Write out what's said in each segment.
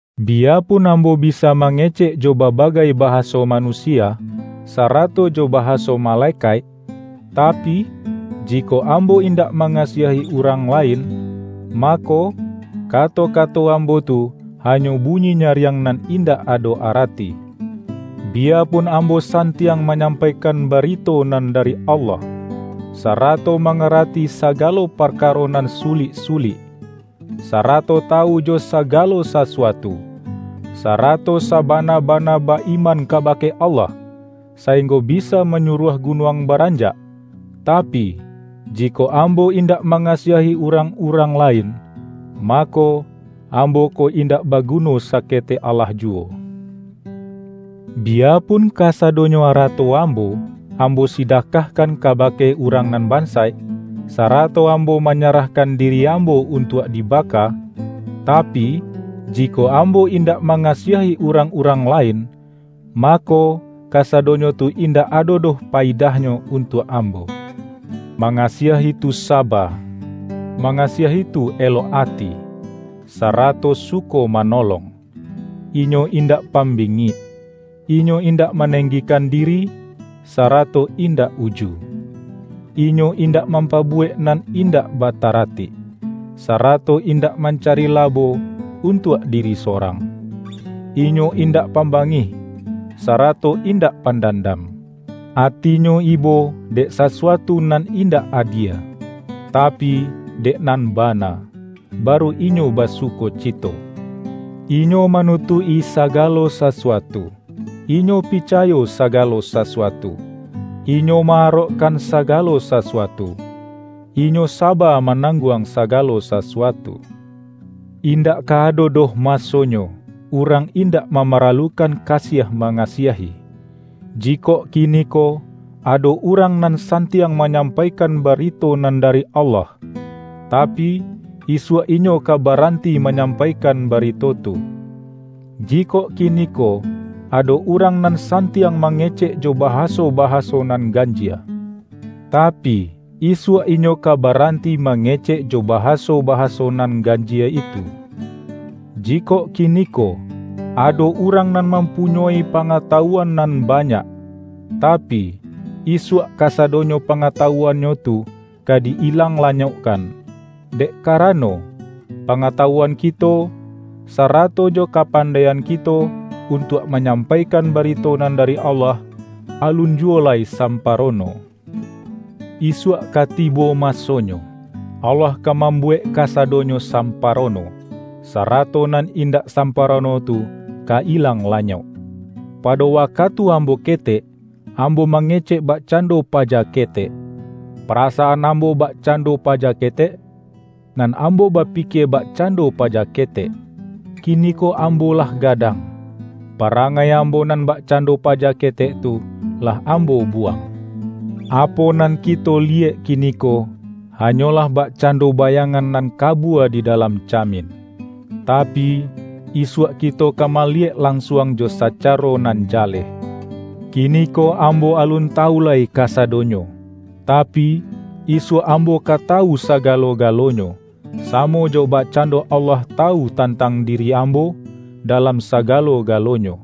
Biyapun ambo bisa mangecek jo babagai bahaso manusia, sara-to jo bahaso malekaik, tapi, jikok ambo indak mangasiahi urang lain, mako, ka-to-kato ambo tu, hanyo bunyi nyariang nan indak ado arati. Biyapun ambo santiang manyampaikan barito nan da-ri Allah, sarato mangarati sagalo parka-ro nan sulik-sulik, sarato tawu jo saga-lo sasuatu, sarato sabana-bana ba-iman kabake Allah, sainggo bisa manyuruah gunuang baranjak, tapi, jikok ambo in-dak mangasiahi urang-urang lain, ma-ko, ambo ko indak baguno saketek alah juwo! Biyapun kasadonyo arato am-bo, ambo sidakahkan kabake urang nan bansaik, sarato ambo manyarahkan di-ri ambo untuak dibaka, tapi, jikok am-bo indak mangasiahi urang-urang la-in, mako, kasadonyo tu indak ado doh payidahnyo untuak ambo. Mangasiahi tu saba; mangasiahi tu elok ati, sarato suko manolong; inyo indak pambingik. Inyo indak maneng-gikan diri, sarato indak uju. Inyo in-dak mampabuwek nan indak bataratik, sarato indak mancari labo untuak diri sorang. Inyo indak pambangih, sara-to indak pandandam. Atinyo ibo dek sasuatu nan indak adie, tapi, dek nan bana, baru inyo basukocito. Inyo ma-nutuik-i sagalo sasuatu, inyo picayo sagalo sasuatu, inyo ma-arokkan sa-galo sasuatu, inyo saba manangguang sagalo sasuatu. Indak ka ado doh masonyo, urang indak mamaralukan kasiah manga-siahi. Jikok kiniko, ado urang nan san-tiang manyampaikan barito nan dari Allah, tapi, isuak inyo ka baranti ma-nyampaikan barito tu. Jikok kiniko, ado urang nan santiang mangecek jo bahaso-bahaso nan ganjie, tapi, isuak inyo ka baranti mangecek jo bahasobahaso nan ganjie itu. Jikok kiniko, ado urang nan mampunyoi pangata-wuan nan banyak, tapi, isuak kasado-nyo pangatawuannyo tu ka di-ilang la-nyokkan. Dek karano, pangatawuan kito, sarato jo kapandaian kito untuak manyampaikan barito nan dari Allah, alun juwo lai samparono. Isuak ka tibo masonyo, Allah ka mambuwek ka-sadonyo samparono, sarato nan indak samparono tu ka ilang lanyok. Pado wakatu ambo ketek, ambo mangecek bakcando paja ketek, parasaan am-bo bakcando paja ketek, nan ambo bapikie bakcando paja ketek. Kini-ko ambo lah gadang, parangai am-bo nan bakcando paja ketek tu, lah ambo buwang. Apo nan kito liyek kiniko, hanyolah bakcando bayang-an nan kabua di dalam camin. Tapi, isuak kito ka maliyek lansuang jo sa-caro nan jaleh. Kiniko ambo alun ta-wu lai kasadonyo, tapi, isuak ambo ka tawu sagalo-galonyo, samo jo bakcan-do Allah tawu tantang diri ambo, da-lam sagalo-galonyo.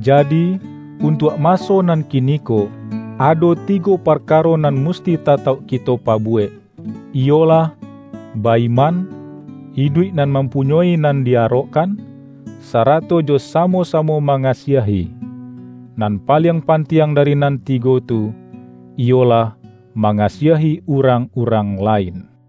Jadi, untuak maso nan kiniko, ado tigo parkaro nan musti tatauk kito pabuwek, iyolah: ba-iman, iduik nan mampunyoi nan di-arokkan, sarato jo samo-samo mangasiahi. Nan paliang pantiang dari nan tigo tu, iyolah, ma-ngasiahi urang-urang lain.